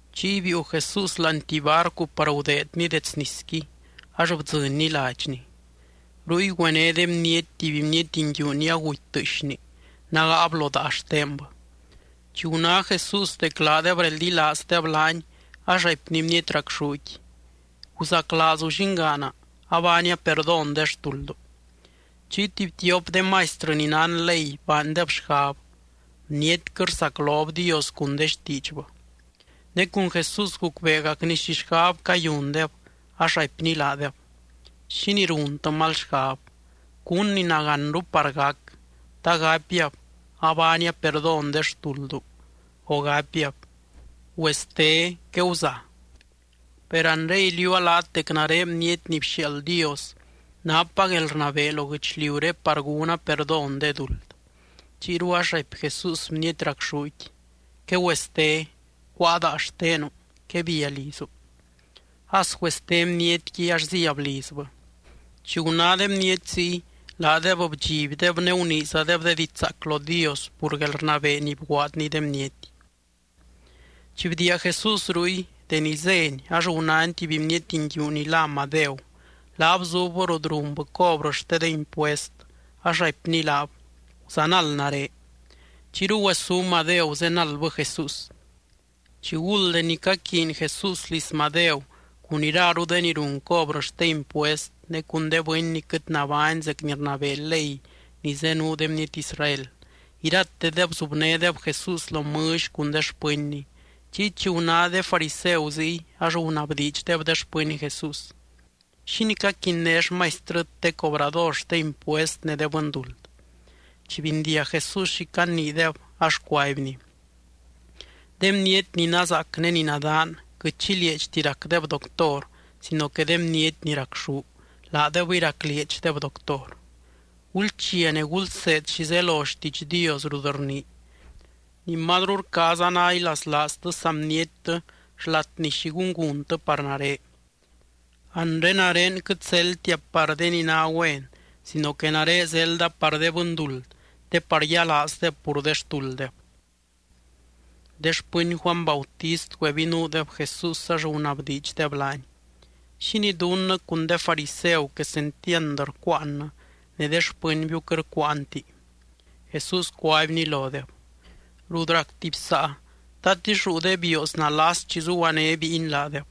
Chiy biiu Jesús láani tuby barcu par gudeedny dets nisqui ax bdzɨnny ladxny. Ruy güené de bniety tuby bniety nguiu ni aguty tɨɨxni, nágaab lo daa xtenbɨ. Chi guná Jesús dec laadeb reldilaazdeb laany ax raipny bniety racxúqui: —Guzaclaazu llingaana. Abaania perdón de xtuldu. Chiy tuby tiop de maistrɨ ni nán ley baandeb xgab: “Bnietquɨ rsaclob Dios cun de xtiidxbɨ.” Ne cun Jesús gucbeegacny xi xgab cayundeb, ax raipny laadeb: —¿Xínii runtɨ mal xgab? ¿Cún ni nagánru par gac? ¿Ta gapiab: “Abaania perdón de xtuldu”, o gapiab: “Güeste, queguza”? Per anre iliuua laat dec nare Bniety ni bxiaald Dios napa guelrnabee lo guɨchliuré par gúna perdón de duld. Chiyru ax raipy Jesús bniety racxúqui: —Quegüeste. Cuáa daa xtenu. Quebia lizu. As güeste bnietqui ax zíab lizbɨ. Chi guná de bniety ziy, laadeb bdxibdeb ne guniizadeb de diidx zaac lo Dios pur guelrnabee ni bguaadny de bniety. Chi bdiia Jesús ruy, deni zény ax gunány tuby bniety nguiu ni lá Madeu. Laab zubbɨ rut runbɨ cobrɨ xte de impuest, ax raipny laab: —Guzanald nare. Chiyru güesú Madeu zenaldbɨ Jesús. Chiguld deni caquiiny Jesús liz Madeu cun iraru de ni run cobrɨ xte impuest ne cun de bɨny ni quɨt nabány zec ni rnabee ley ni zenuu de bniety Israel, iratedeb zubnédeb Jesús lo mɨlly cun de xpɨnny. Chiy chi guná de fariseu ziy, ax gunabdiidxdeb de xpɨny Jesús: —¿Xínii caquinné xmaistrɨt de cobrador xte impuest ne de bɨnduld? Chi bindiag Jesús xi caniideb, ax cuaibny: —De bniety ni nazaac ne ni nadaan quɨt xi lieedxti racdeb doctor sino que de bniety ni racxú, laadebɨy raclieedxdeb doctor. Gulchia ne gulseed xi zelo xtiidx Dios rut rnii: “Ni mazru rcaaza ná ilaslaaztɨ saa bniettɨ xlat ni xi gúnguntɨ par nare.” Anre, nare quɨt zeldtia par de ni ná güen sino que nare zelda par de bɨnduld te par yialaazdeb pur de xtulddeb. De xpɨny Juany Bautist güebinuudeb Jesús, ax gunabdiidxdeb laany: —¿Xínii dunnɨ cun de fariseu quesentiand rcuuannɨ, ne de xpɨnbiu quɨt rcuuanti? Jesús cuaibny lodeb: —Rut rac tuby saa, ¿tatix ruu de bioos nalas chi zuguané bíiny laadeb?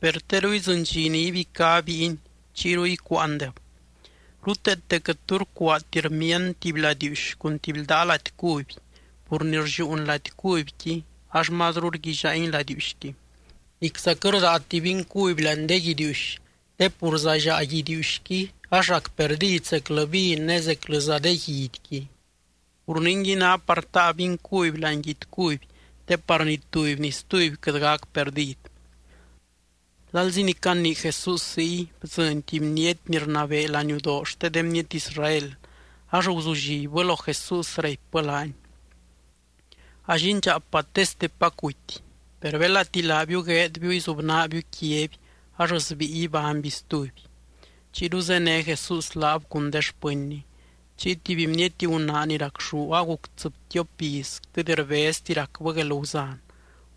Per teru idzɨny dxi ni ibicá bíiny, chiyru icuuandeb. ’Ruteete quɨt tu rcuaati rmiand tuby ladiiuxy cun tuby ldaa lady cuby pur ni rlliuun lady cubyqui, ax mazru rguillaangui ladiiuxqui. Nicza quɨt rdaati vin cuby láani de guidiiuxy, te pur zallaa guidiiuxqui, ax rac perdid zeclɨ vin ne zeclɨza de guidyqui. Pur ningui ná par taa vin cuby láani guidy cuby, te par ni tuby ni stuby quɨt gac perdid. Lalzi ni canii Jesús ziy, bdzɨny tuby bniety ni rnabee laniudoo xte de bniety Israel, ax guzullibbɨ lo Jesús, raipbɨ laany: —A llindxaapa téstepac guty. Per belati laabiu gueedbiu izubnaabiu quiaby ax sbíi ibányby stuby. Chiyru zéne Jesús laab cun de xpɨnny. Chiy tuby bniety gunaa ni racxú aguc tsɨbtiop iz quɨt rbezti racbɨ guelguzan,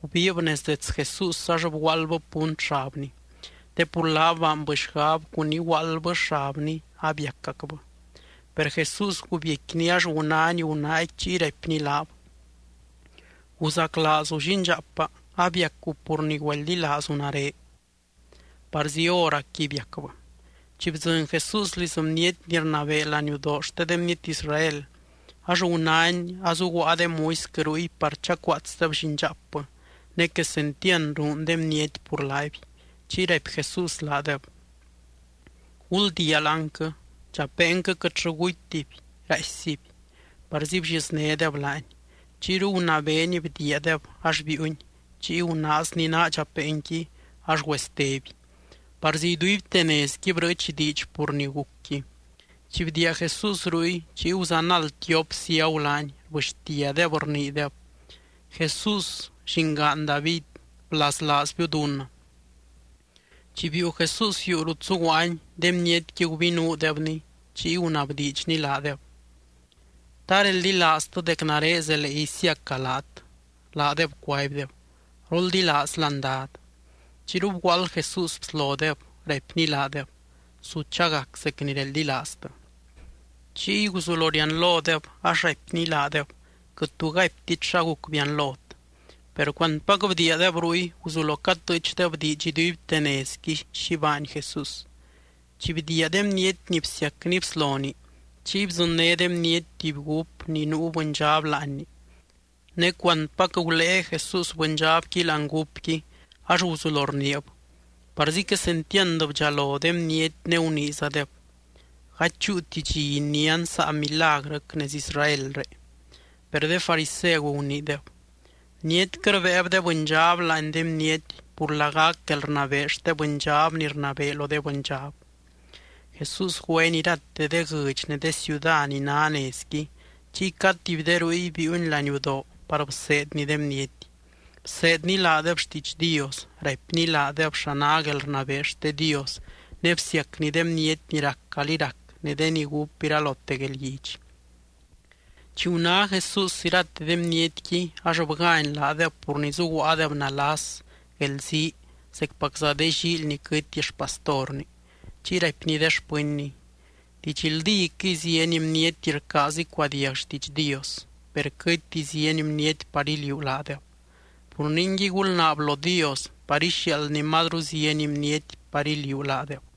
gubiib nez dets Jesús ax bguaaldbɨ punt xabny. Te pur laab baanbɨ xgab cun iguaaldbɨ xabny abiacacbɨ. Per Jesús gubiecquiny, ax gunány gunaaqui chiy raipny laab: —Guzaclaazu llindxaapa. Abiacu pur ni güeldilaazu nare. Parzi hóracqui biacbɨ. Chi bdzɨny Jesús liz bniety ni rnabee laniudoo xte de bniety Israel, ax gunány azuguaa de muisquɨ ruy par chacuaatsdeb llindxaapbɨ, ne quesentiand ruun de bniety pur laaby. Chiy raipy Jesús laadeb: —Guldiia láanquɨ. Dxapeenquɨ quɨtllɨ gutytiby, raaissiby. Parzi blliznédeb laany. Chiyru gunabeeny bdiiadeb, ax biiuny. Chiy gunaazny naa dxapeenqui, ax güesteby. Parzi iduibte nezqui brɨɨch diidx pur ni gucqui. Chi bdiia Jesús ruy, chiy guzanald tiop ciagu laany, rbɨxtiadeb, rniideb: —¡Jesús, llingaan David, blaslaazbiu dunnɨ! Chi biiu Jesús yuu rut zuguaany, de bnietqui gubinuudebny, chiy gunabdiidxny laadeb: —¿Ta reldilaaztɨ dec nare zelee isiaca laat? Laadeb cuaibdeb: —Roldilaazlan, Dad. Chiyru bguaald Jesús bslodeb, raipny laadeb: —Su chagac zec ni reldilaaztɨ. Chiy guzulo rianlodeb, ax raipny laadeb: —Quɨt tu gaiptit xa guc bianlot. Per cuantpac bdiiadeb ruy, guzulo catɨɨchdeb diidx iduibte nezqui xi baany Jesús. Chi bdiia de bniety ni bsiacny bsloni, chiy bdzɨnné de bniety tuby gúp ni nuu bɨndxab láanni. Ne cuantpac gulée Jesús bɨndxabqui láani gúpqui, ax guzulo rniib. Parzi quesentiand bdxalo de bniety ne guniizadeb: —Gady chúuti dxi inián saa milagrɨc nez Israelré. Per de fariseu guniideb: —Bnietquɨ rbéeb de bɨndxab láani de bniety pur lagac guelrnabee xte bɨndxab ni rnabee lo de bɨndxab. Jesús güeny irate de guɨdx ne de ciuda ni ná nezqui, chiy cad tuby de ruy biiuny laniudoo par bseedny de bniety. Bseedny laadeb xtiidx Dios, raipny laadeb xa ná guelrnabee xte Dios ne bsiacny de bniety ni rac calí rac ne de ni gúp iralote guelguidx. Chi guná Jesús irate de bnietqui ax bgány laadeb pur ni zuguaadeb nalas, guelzii zecpacza de llíily ni quɨty xpastorni. Chiy raipny de xpɨnny: —Didxldíquɨy, zieny bniety rcaaz icuadiag xtiidx Dios, per quɨtti zieny bniety par iliuu laadeb. Pur ningui, gulnaab lo Dios par ixiaaldny mazru zieny bniety par iliuu laadeb.